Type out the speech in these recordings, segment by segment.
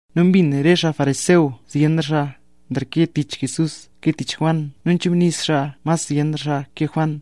Nu mbin re xaa fariseo zyenra xaa nreke tich Jesús ke tich Juan nu nzhachubnis xaa mas zyenra xaa ke Juan.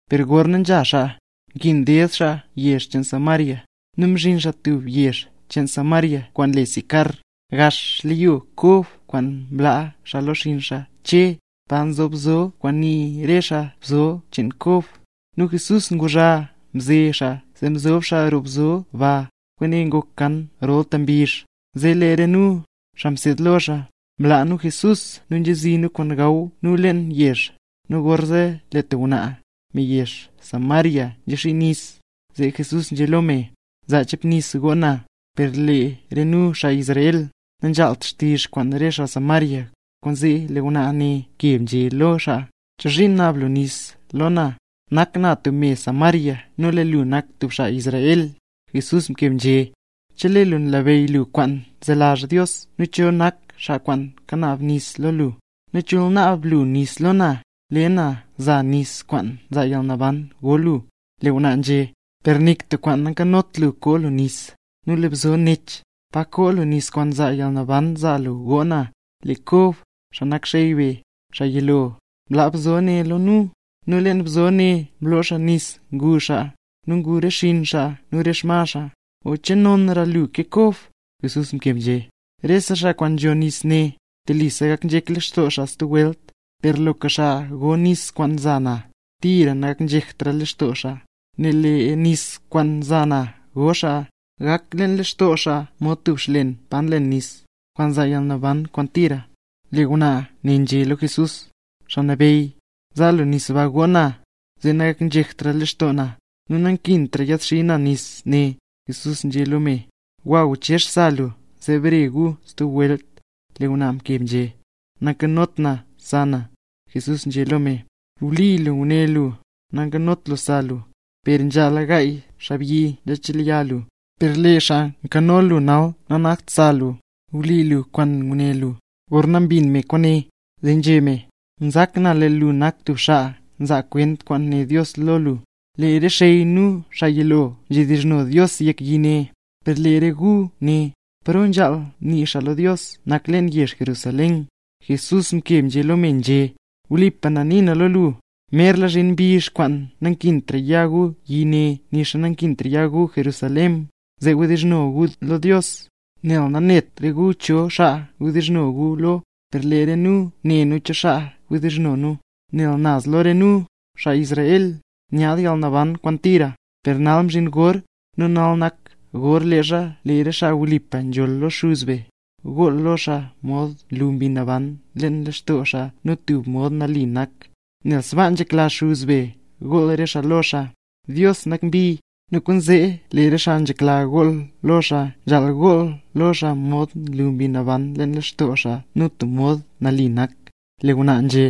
Per gorna nzha xaa, nkin ded xaa yizhyo cheen Samaria. Nu mzhin xaa tub yezh cheen Samaria kwaan le Sicar, gax xleyo Kob kwaan mlaa xaa lo xinn xaa Che, pa nzob bzo kwaan nii re xaa, bzo cheen Kob. Nu Jesús nguzha mze xaa zee mzob xaa roo bzo ba, kwaane ngok kan rolta mbizh. Zee lee re nu, xaa mseed lo xaa, mlaa nu Jesús nu nzhazi nu kwaan gaw nu leen yezh. Nu gorzee lee tub ngwnaa, me yezh Samaria nzexii nis, zee Jesús nzhé lo me: —Zaa chep nis goo na. Per lee re nu, xaa Israel, nanzhaalt xtizh kwaan re xaa Samaria, kwaanzee lee ngwnaa ne mkeb, nzhé lo xaa: —¿Chozhiin naab lu nis lo na, nak na tub me Samaria nu lee lu nak tub xaa Israel? Jesús mkeb nzhé: —Chelee lu nlabeyy lu kwaan nzelazh Dios nu cho nak xaa kwaan kanaab nis lo lu, nu chol naab lu nis lo na, lee na za nis kwaan nzaa yalnaban go lu. Lee ngwnaa nzhé: —Per nik tub kwaan nankanot lu koo lu nis, nu lee bzo nech; ¿pa koo lu nis kwaan nzaa yalnaban zaa lu goo na? Lee Kob, xaa nak xey be, xaa yilo, mlaa bzo ne lo nu, nu leen bzo ne mloo xaa nis ngu xaa, nu ngu re xinn xaa nu re xma xaa. ¿O che nonra lu ke Kob? Jesús mkeb nzhé: —Rese xaa kwaan nzho nis ne, telisa gak nzhek lextoo xaa stub welt; per loka xaa go nis kwaan za na, tira nagaknzhektra lextoo xaa. Nel lee nis kwaan za na go xaa, gak leen lextoo xaa mod tub xlen pa nlen nis, kwaan nzaa yalnaban kwaan tira. Lee ngwnaa ne nzhé lo Jesús: —Xaa Nabeyy, zaa lu nis ba goo na, zee nagaknzhektra lextoo na, nu nankintra yaadxii na nis nee. Jesús nzhé lo me: —Gwa, gwachezh sa lu zee bare gu stub welt. Lee ngwnaa mkeb nzhé: —Nankanot na sa na. Jesús nzhé lo me: —Wli lu nguné lu, nankanot lu sa lu; per nzhala gaay xaabyi nzhachelya lu, per lee xaa nkano lu nal nanakt xaa sa lu. Wli lu kwaan nguné lu. Gorna mbin me kwaane, zee nzhé me: —Nzak na lee lu nak tub xaa nzaa kwent kwaan né Dios lo lu. Lee re xey nu xaa yilo nzhedizhno Dios yek yi ne, per lee re gu né; paro nzhaal nii xaa lo Dios nak leen yezh Jerusalén. Jesús mkeb lo me, nzhé: —Wlipa na nii na lo lu, merla zhin mbizh kwaan nankintra ya gu yi ne nixa nankintra ya gu Jerusalén, zee wdizhno gu lo Dios. Nel nanet re gu cho xaa wdizhno gu lo, per lee re nu ne nu cho xaa nzhedizhno nu, nel naz lo re nu, xaa Israel, nyaad yalnaban kwaan tira. Per nal mzhin gor, nu nal nak gor leezha lee re xaa wlipa nzholl lo Xuz be, gool lo xaa mod nlu Mbi Naban leen lextoo xaa nu tub mod nali nak. Nel sbaa nzhekla Xuz be gool re xaa lo xaa. Dios nak mbi, nu kwaanzee lee re xaa nzhekla gool lo xaa nzhaal gool lo xaa mod nlu Mbi Naban leen lextoo xaa, nu tub mod nali nak. Lee ngwnaa nzhé: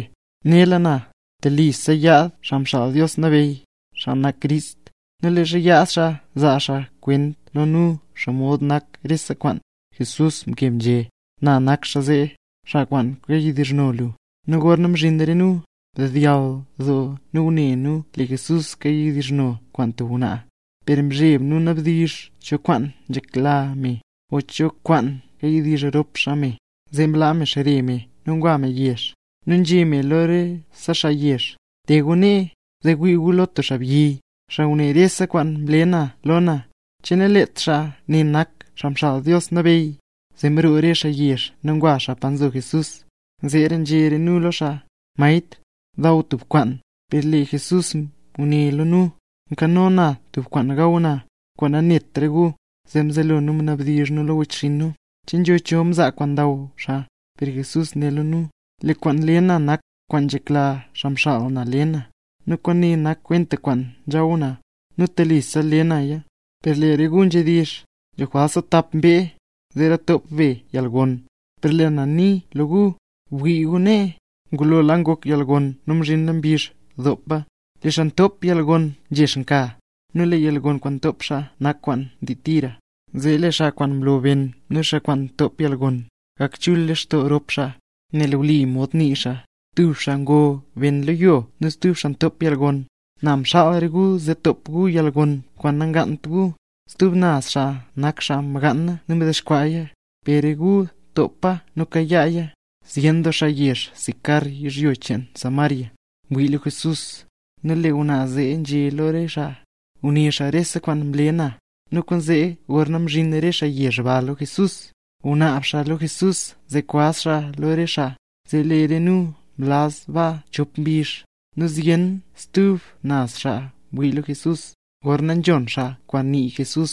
—Nela na, telisa yaad Xaa Xaal Dios Nabeyy, xaa nak Crist; nu leezha yaad xaa, zaa xaa kwent lo nu xomod nak rese kwaan. Jesús nzhé: —¡Na nak xaa zee, xaa kwaan kayawdizhno lu! Nu gorna mzhin re nu, mdedyall doo nu ngune nu lee Jesús kayawdizh kwaan tub ngwnaa. Per mzheb nu nabdizh cho kwaan nzhekla me, o cho kwaan kayadizh rop xaa me. Zee mlaa me xre me nu ngwa me yezh, nu nzhé me lo rese xaa yezh: —Te gu nee, zee wii gu lo tub xaabyi, xaa nguné rese kwaan mle na lo na. ¿Che nalet xaa ne nak Xaa Xaal Dios Nabeyy? Zee mroo re xaa yezh nu ngwa xaa pa nzo Jesús. Zeera nzhé re nu lo xaa: —Maestr, daw tub kwaan. Per lee Jesús nguné lo nu: —Nkano na tub kwaan gaw na, kwaan nanet re gu. Zee mzelo nu mnabdizh nu lo wechxinn nu: —¿Che nzho cho mzaa kwaan ndaw xaa? Per Jesús né lo nu: —Lee kwaan nle na nak kwaan nzhekla xaa mxaal na le na, nu kwaane nak kwenta kwaan nzhaw na, nu telisa le naya. Per lee re gu nzhedizh: “Nzho jwalt stub tap mbee, zeera top be yalgon”. Per lee na nii lo gu, bwii gu nee, ngulola ngok yalgon nu mzhinla mbizh dopa. Lee xaa ntop yalgon nzhex nka, nu lee yalgon kwaan ntop xaa nak kwaan ndii tira, zee lee xaa kwaan mlo ben nu xaa kwaan mtop yalgon, gak chul lextoo rop xaa. Nel wli mod nii xaa: “Tub xaa ngo ben lo yo nu stub xaa ntop yalgon”. Na mxaal re gu zee top gu yalgon kwaan namgaant gu, stub naz xaa nak xaa mgaana nu mdexkwaaya, per re gu topa nu kayaaya. Zyen doo xaa yezh Sicar yizhyo cheen Samaria, mwii lo Jesús, nel lee ngwnaa zee nzhé lo re xaa: “Nguné xaa rese kwaan mle na”. Nu kwaanzee gorna mzhin re xaa yezh ba lo Jesús, ngunaab xaa lo Jesús zee kwaz xaa lo re xaa. Zee lee re nu mlaz baa chop mbizh. Nu zyen stub naz xaa mwii lo Jesús, gorna nzhon xaa kwaan nii Jesús.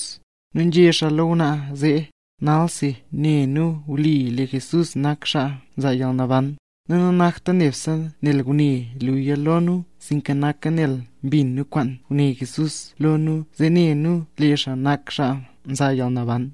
Nu nzhé xaa lo ngwnaa zee: —Nalsi ne nu wli lee Jesús nak xaa nzaa yalnaban, nu nanakta nebse nel nguné luya lo nu sinka noka nel mbin nu kwaan nguné Jesús lo nu zee ne nu lee xaa nak xaa nzaa yalnaban.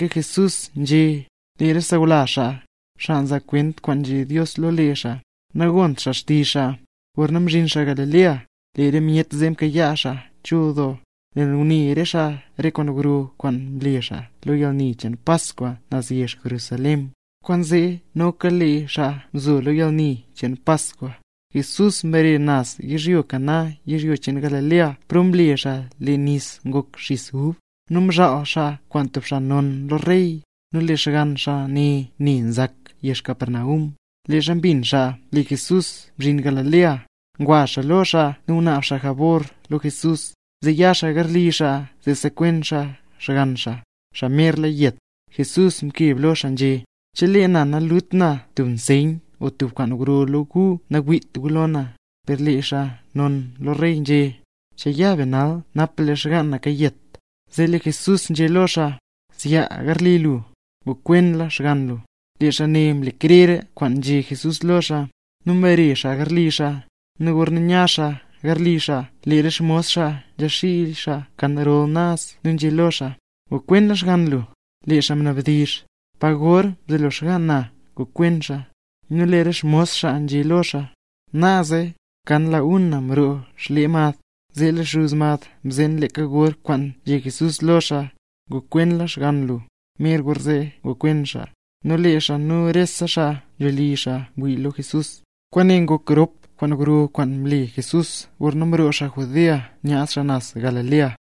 Nu leeka Jesús nzhé, lee re sawlazh xaa, xaa nzaa kwent kwaan nzhé Dios lo lee xaa, nagont xaa xtizh xaa. Gorna mzhin xaa Galilea, lee re myet zee mkayaa xaa chul doo, nel ngune re xaa re kwaan gro kwaan mle xaa lo yalni cheen Paskwa naz yezh Jerusalén, kwaanzee noka lee xaa mzo lo yalni cheen Paskwa. Jesús mbare naz yezh Caná yizhyo cheen Galilea, paro mle xaa lee nis ngok xis ub. Nu mzhaal xaa kwaan tub xaa non lo rey, nu lee xgann xaa ne ne nzak yezh Capernaum. Leezha mbin xaa ne lee Jesús mzhin Galilea, ngwa xaa lo xaa nu ngunaab xaa jabor lo Jesús, zee ya xaa garli xaa zee sekwen xaa xgann xaa, xaa merla yet. Jesús mkeb lo xaa nzhé: —Chelee na nalut na tub nseyn o tub kwaan gro lo gu nawiit gu lo na. Per lee xaa non lo rey nzhé: —Chaa ya be nal, napa lee xgaan na kayet. Zee lee Jesús nzhé lo xaa: —Zyaa garli lu; ngokwenla xgann lu. Lee xaa ne mle krer kwaan nzhé Jesús lo xaa, nu mbare xaa garli xaa. Nu gorna nya xaa garli xaa, lee re xmos xaa nzhaxiila xaa kan rol naz nu nzhé lo xaa: —¡Ngokwenla xgann lu! Lee xaa mnabdizh: —¿Pa gor mzelo xgaan na ngokwen xaa? Nu lee re xmos xaa nzhé lo xaa: —Naaze, kan la una mroo xlee mad. Zee lee xuz mad mzeen leeka gor kwaan nzhé Jesús lo xaa: “Ngokwenla xgann lu”, mer gorzee ngokwen xaa. Nu lee xaa nu rese xaa nzho li xaa mwii lo Jesús. Kwaane ngok rop kwaan gro kwaan mle Jesús gorna mroo xaa Judea nyaad xaa naz Galilea.